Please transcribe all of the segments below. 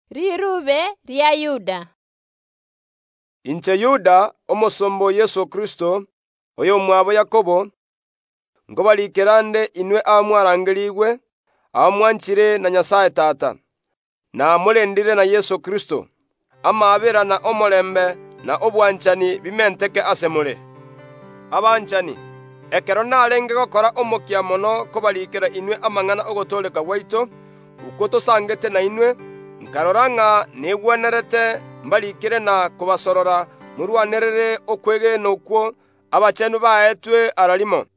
Korwa ase Yuda, omosomba o Yeso Kristo, oyomwabo Yakobo, nkobarikera nde inwe abamwarangerigwe, abamwanchire na Nyasae Tata, na morendire na Yeso Kristo. Amaabera, na omorembe, na obwanchani, bimenteke ase more. Abanchani, ekero narenge gokora omokia mono kobarikera inwe amang’ana ogotooreka gwaito, okwo tosangete nainwe, nkarora ng’a negwenerete mbarikere na kobasorora morwanerere okwegena okwo abachenu baetwe ara rimo.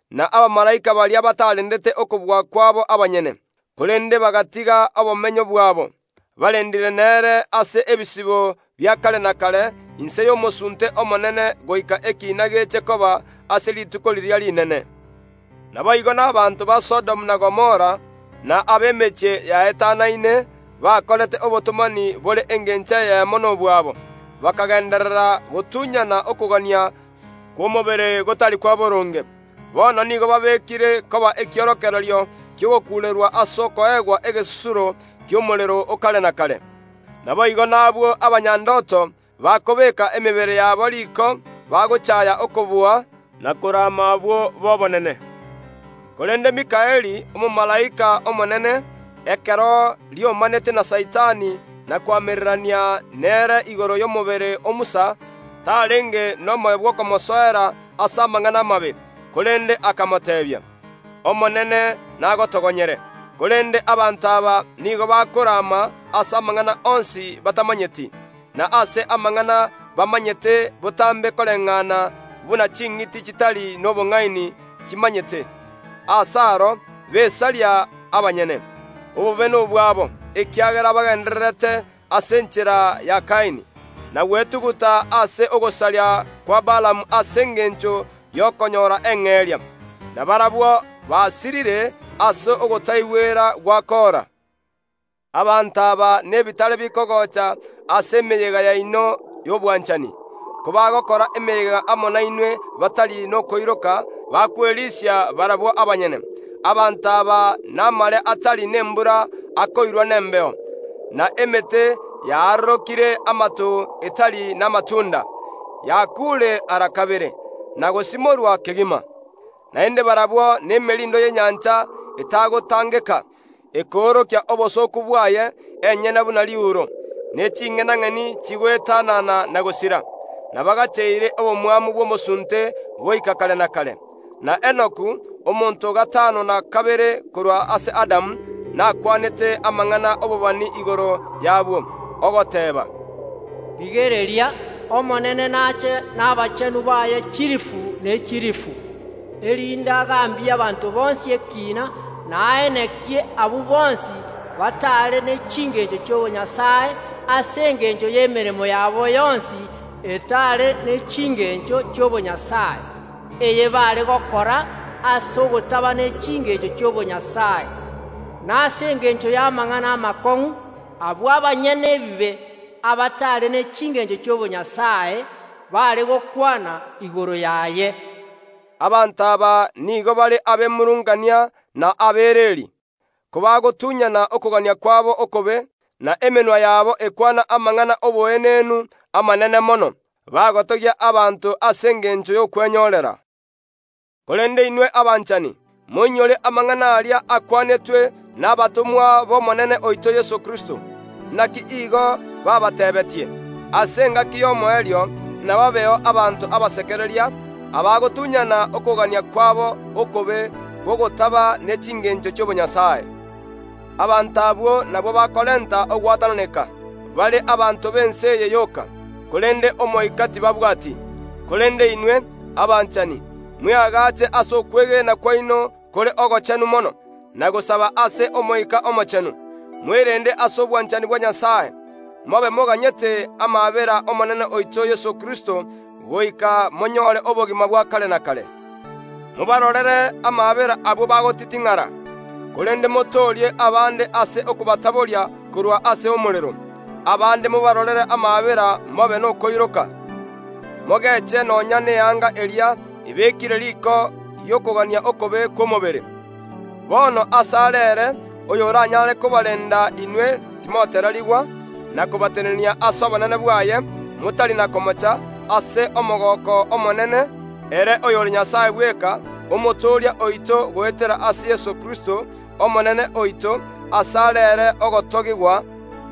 Na abamalaika baria batarendete okobua kwabo abanyene, korende bagatiga obomenyo bwabo, barendire nere ase ebisibo bia kare na kare inse y’omosunte omonene goika ekiina geche koba ase rituko riria rinene. Naboigo nabaanto ba Sodomu na Gomora, na ab’emechie yaetanaine, bakorete obotomani bore engencho eyemo nobw’abwo, bakagenderera gotunyana okogania kw’omobere gotari kwa boronge. Bono nigo babekire koba ekiorokererio ki’ogokuurerwa ase okoegwa egesusuro ki’omorero o kare na kare. Naboigo nabwo abanyandoto bakobeeka emebere yabo riko bagochaaya okobua, na korama abwo b’obonene. Korende Mikaeli, omomalaika omonene, ekero riomanete na Saitani na koamererania nere igoro y’omobere o Musa, tarenge nomoyo bw’okomosoera ase amang’ana amabe, korende akamoteebia, “Omonene nagotogonyere.” Korende abanto aba nigo bakorama ase amang’ana onsi batamanyeti, na ase amang’ana bamanyete botambe koreng’ana buna ching’iti chitari nobong’aini chimanyete; ase aro besaria abanyene. Obobe nobwabo, ekiagera bagendererete ase enchera ya Kaini, na gwetuguta ase ogosaria kwa Baalamu ase engencho y’okonyora eng’eria, na barabwo basirire ase ogotaigwera gwa Kora. Abanto aba nebitare bikogocha ase emeyega yaino y’obwanchani, kobagokora emeyega amo nainwe batari nokoiroka, bakwerisia barabwo abanyene. Abanto aba namare atari nembura akoirwa nembeo, na emete yaarorokire amato etari namatunda, yakuure ara kabere, na gosimorwa kegima. Naende barabwo nemerindo y’enyancha etagotangeka, ekoorokia obosooku bwaye enyene buna riuro, ne ching’enang’eni chigoetanana na gosira, na bagacheire omosunte ekerima goika kare na kare. Na Enoku, omonto o gatano na kabere korwa ase Adamu, nakwanete amang’ana obobani igoro y’abwo, ogoteeba, “Rigereria, Omonene nache nabachenu baye chilifu ne chilifu, erinde agambie abanto bonsi ekiina na aenekie abwo bonsi batare ne chingencho chi’obonyasae ase engencho y’emeremo yabo yonsi etare ne chingencho chi’obonyasae, eye baare gokora ase ogotaba ne chingencho chi’obonyasae, na ase engencho y’amang’ana amakong’u abwo abanyene ebibe, abatare ne chingencho chi’obonyasae, baare gokwana igoro yaye.” Abanto aba nigo bare abemurungania na abereri, kobagotunyana okogania kwabo okobe, na emenwa yabo ekwana amang’ana ’oboenenu amanene mono, bagotogia abanto ase engencho y’okwenyorera. Korende inwe abanchani, moinyore amang’ana aria akwanetwe nabatomwa b’Omonene oito Yeso Kristo. Naki igo babateebetie, “Ase engaki y’omoerio nababeo abanto abasekereria, abagotunyana okogania kwabo okobe kw’ogotaba ne chingencho chi’obonyasae.” Abanto abwo nabwo bakorenta ogwatananeka, bare abanto b’ense eye yoka, korende Omoika tibabwati. Korende inwe, abanchani, mweagache ase okwegena kwaino kore ogochenu mono, na gosaba ase Omoika Omochenu. Mwerende ase obwanchani bwa Nyasae, mobe moganyete amaabera Omonene oito Yeso Kristo goika monyore obogima bwa kare na kare. Mobarorere amaabera abwo bagotiting’ara. Korende motoorie abande ase okobataboria korwa ase omorero. Abande mobarorere amaabera mobe nokoiroka, mogeche nonya neanga eria ebekire riko ri’okogania okobe kw’omobere. Bono asare ere oyoranyare kobarenda inwe timotererigwa, na kobatenenia ase obonene bwaye, motari na komocha, ase omogooko omonene, ere oyore Nyasae bweka, Omotooria oito goetera ase Yeso Kristo, Omonene oito, asare ere ogotogigwa,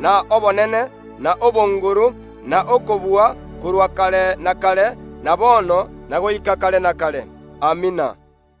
na obonene, n’echinguru, na okobua, korwa kare na kare, na bono, na goika kare na kare. Amina.